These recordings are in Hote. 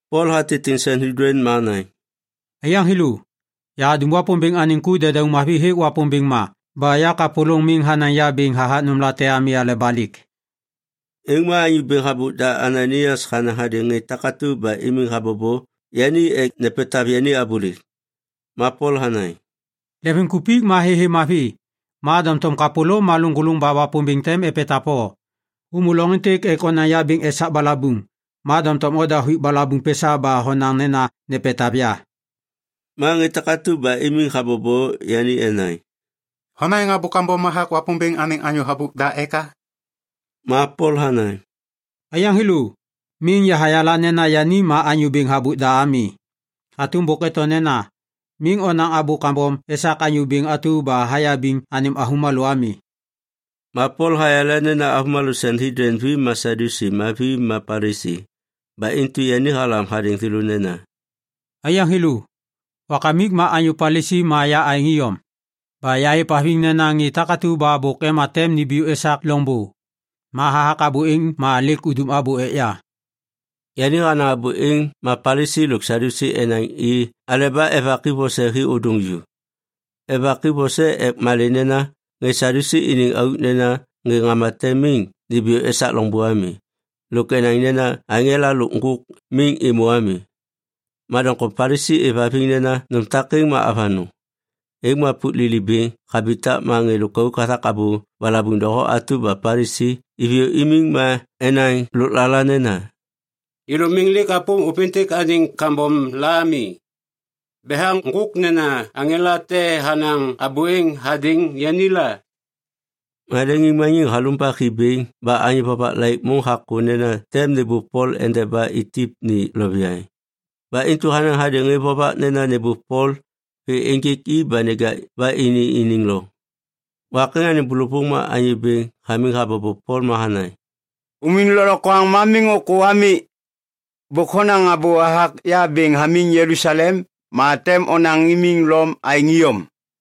Pol hatitiŋ Sanhedlin ma hanaŋ, “Aiyaŋ thêlô, yahadum Wapômbêŋ anêŋ ku dedauŋ mavi hêk Wapômbêŋ ma ba yakapôlôŋ miŋ hanaŋ ya bêŋ hathak nômlate ami aleba lêk.” Êŋ ma anyô bêŋ habôk da Ananaias hanaŋ hadêŋ ŋê takatu ba imiŋ habobo yani ek nepetav yani abôlêk. Ma Pol hanaŋ, “Lemvimkupik ma thêthê mavi, ma doŋtom kapôlôm ma lôŋgôlôŋ ba Wapômbêŋ tem epetav o. Hômô loŋ êntêk ek onaŋ ya bêŋ esak balabuŋ, ma doŋtom oda huik balabuŋ pesa ba honaŋ nena nepetav ya.” Ma ŋê takatu ba imiŋ habobo yani enaŋ, “Honaŋ abô kambom hathak Wapômbêŋ anêŋ anyô bêŋ habôk da eka?” Ma Pol hanaŋ, “Aiyaŋ thêlô, miŋ yahayala nena yani ma anyô bêŋ habôk da ami. Hatôm bôk eto nena, ‘Miŋ nonaŋ abô kambom esak anyô bêŋ atu ba hayabiŋ anêm avômalô ami.’” Ma Pol hayala nena avômalô Sanhedlin vi ma Sadyusi ma vi ma Palisi. Ba intu yani halam hadêŋ thêlô nena, “Aiyaŋ thêlô, wakamik ma anyô Palisi ma ya aêŋ iyom. Ba yahêvhaviŋ nena ŋê takatu ba bôk ema tem nimbiyô esak loŋbô, ma hathak abô êŋ ma lêk udum abô ek ya.” Yani hanaŋ abô êŋ ma Palisi lôk Sadyusi enaŋ i aleba evak i vose hi ôdôŋ ju. Evak i vose ek malê nena ŋê Sadyusi iniŋ auk nena ŋê ŋama tem miŋ nimbiyô esak loŋbô ami, lôk enaŋ nena aŋela lôk ŋgôk miŋ êmô ami. Ma doŋtom Palisi êvhaviŋ nena nôm takêŋ ma avanôŋ. Êŋ ma pôk lili bêŋ habitak ma ŋê lôkauk hathak abô balabuŋ doho atu ba Palisi, iviyô imiŋ ma enaŋ lôklala nena, “Yêlô miŋ lêk apôm ôpêntêk anêŋ kambom la ami. Betha ŋgôk mena aŋela te hanaŋ abô êŋ hadêŋ yani la.” Ma leŋiŋmaniŋ halumbak hi bêŋ ba anyô vovak laik môŋ hakô nena tem nêbôv Pol endeba itip ni loviaŋ. Ba intu hanaŋ hadêŋ ŋê vovak nena nêbôv Pol vê ênjêk i ba neja ba ini iniŋ loŋ. Wak êŋ anêŋ bôlôvôŋ ma Anyô Bêŋ hamiŋ habobo Pol ma hanaŋ, “Umiŋ lôklokwaŋ ma miŋ ôkô ami! Bôk honaŋ abô hathak ya bêŋ hamiŋ Jelusalem ma tem onaŋ imiŋ Lom aêŋ iyom.”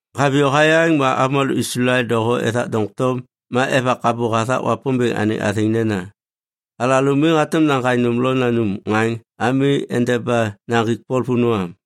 Haviyô hayaŋ ma avômalô Islael doho ethak doŋtom ma evak abô hathak Wapômbêŋ anêŋ athêŋ nena, “Alalô miŋ hatôm naŋgaŋ nôm lo nanum ŋaŋ ami endeba naŋgik Pol vônô am.”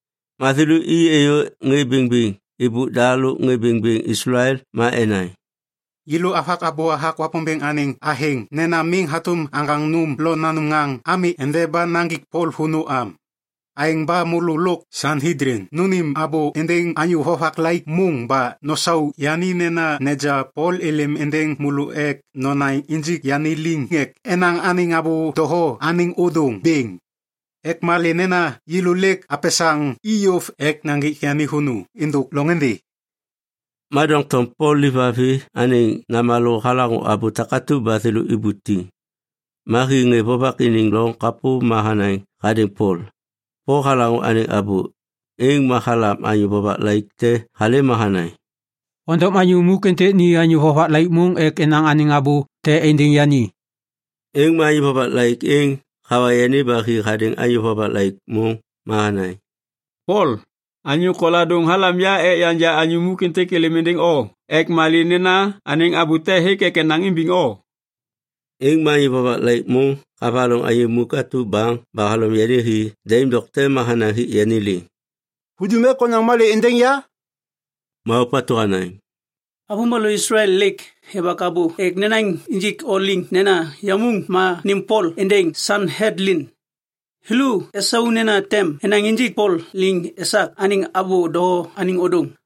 Ma thêlô i êyô ŋê bêŋbêŋ êbôk da lôk ŋê bêŋbêŋ Islael ma enaŋ, “Yêlô avak abô hathak Wapômbêŋ anêŋ athêŋ nena miŋ hatôm aŋgaŋ nôm lo nanum ŋaŋ ami endeba naŋgik Pol vônô am. Aêŋ ba môlô lôk Sanhedlin nônêm abô êndêŋ anyô vovak laik môŋ ba nosau yani nena neja Pol êlêm êndêŋ môlô ek nonaŋ injik yani liŋ ek enaŋ anêŋ abô doho anêŋ ôdôŋ bêŋ. Ek malê nena yêlô lêk apesaŋ i yôv ek naŋgik yani vônô êndôk loŋôndê.” Ma doŋtom Pol livavi anêŋ namalô halaŋô abô takatu ba thêlô ibutiŋ. Ma hi ŋê vovak iniŋ loŋ kapô ma hanaŋ hadêŋ Pol. Pol halaŋô anêŋ abô, êŋ ma halam anyô vovak laik te halêm ma hanaŋ, “Ondom anyô muk êntêk ni anyô vovak laik môŋ ek enaŋ anêŋ abô te êndêŋ yani.” Êŋ ma anyô vovak laik êŋ hawa yani ba hi hadêŋ anyô vovak laik môŋ ma hanaŋ, “Pol anyô koladôŋ halam ya ek yanja anyô muk êntêk êlêm êndêŋ o. Ek malê nena anêŋ abô te hêk ek enaŋ imbiŋ o.” Êŋ ma anyô vovak laik môŋ havaloŋ anyô muk atu baŋ ba halom yani hi daim dokte ma hanaŋ hik yani liŋ, “Hudum ek onaŋ malê êndêŋ ya?” Ma ôpatu hanaŋ, “Avômalô Islael lêk evak abô ek nenaŋ injik o liŋ nena yamuŋ ma nêm Pol êndêŋ Sanhedlin. Thêlô esau nena tem nenaŋ injik Pol liŋ esak anêŋ abô doho anêŋ ôdôŋ.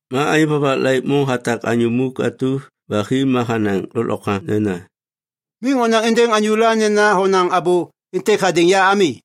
Ma anyô vovak laik môŋ hatak anyô muk atu ba hi ma hanaŋ lôklokwaŋ nena, “Miŋ onaŋ êndêŋ anyôla nena honaŋ abô êntêk hadêŋ ya ami.”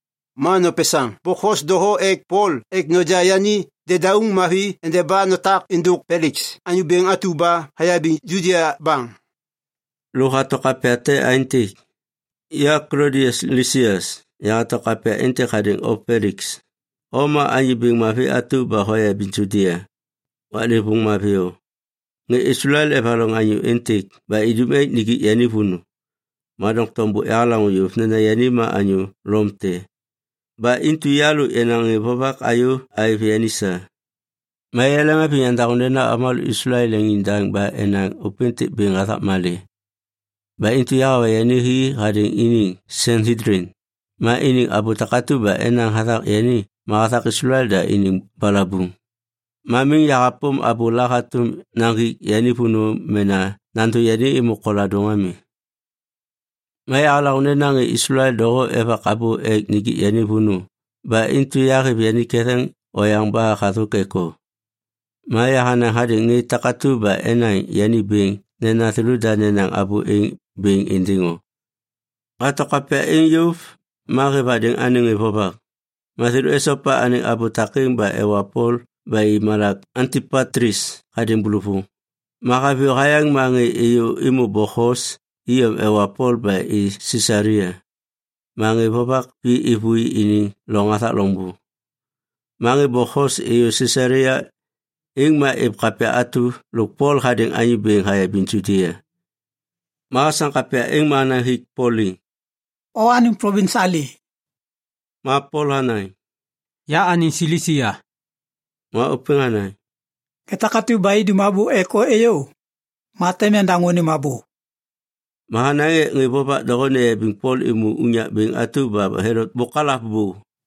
Ma nopesaŋ bokhos doho ek Pol ek noja yani dedauŋ mavi endeba notak êndôk Peliks anyô bêŋ atu ba hayabiŋ Judia baŋ.” Lôk hato kapya te aêntêk: Ya Klodias Lisias, yahato kapya êntêk hadêŋ o Peliks, O ma anyô bêŋ mavi atu ba hoyabiŋ Judia. Waklêvôŋ mavi o! Ŋê Islael evaloŋ anyô êntêk ba idum ek nijik yani vônô, ma doŋtom bôk yahalaŋô yôv nena yani ma anyô Lom te. Ba intu ya lôk yenaŋ ŋê vovak ayô aêv yani sa. Ma yaleŋhaviŋ yandaŋô nena avômalô Islael leŋiŋdaŋ ba enaŋ ôpêntêk bêŋ hathak malê. Ba intu yahawa yani hi hadêŋ iniŋ Sanhedlin. Ma iniŋ abô takatu ba enaŋ hathak yani ma hathak Islael da iniŋ balabuŋ, ma miŋ yahapôm abôla hatôm naŋgik yani vônô mena nandô yani êmô koladôŋ ami. Ma yahalaŋô nena ŋê Islael doho evak abô ek nijik yani vônô, ba intu yahêv yani ketheŋ oyaŋ ba hathôk ek o. Ma yahanaŋ hadêŋ ŋê takatu ba enaŋ yani bêŋ nena thêlôda nenaŋ abô êŋ bêŋ êndêŋ o. Hato kapya êŋ yôv, ma hêv hadêŋ anêŋ ŋê vovak. Ma thêlô esopa anêŋ abô takêŋ ma ewa Pol ba i malak Antipatlis hadêŋ bôlôvôŋ. Ma haviyô hayaŋ ma ŋê êyô êmô bokhos iyom ewa Pol ba i Sisalia. Ma ŋê vovak vi êvôi iniŋ loŋ hathak loŋbô. Ma ŋê bokhos êyô Sisalia, êŋ ma êv kapya atu lôk Pol hadêŋ anyô bêŋ hayabiŋ Judia. Ma hasam kapya êŋ ma hanaŋ hik Pol liŋ, “O anêŋ plovins alê?” Ma Pol hanaŋ, “Ya anêŋ Silisia.” Ma ôpêŋ hanaŋ, “Ŋê takatu ba idum abô ek o êyô, ma tem yandaŋô anêm abô.” Ma hanaŋ ek ŋê vovak doho neyabiŋ Pol êmô unyak bêŋ atu ba Helot bôk halav bô.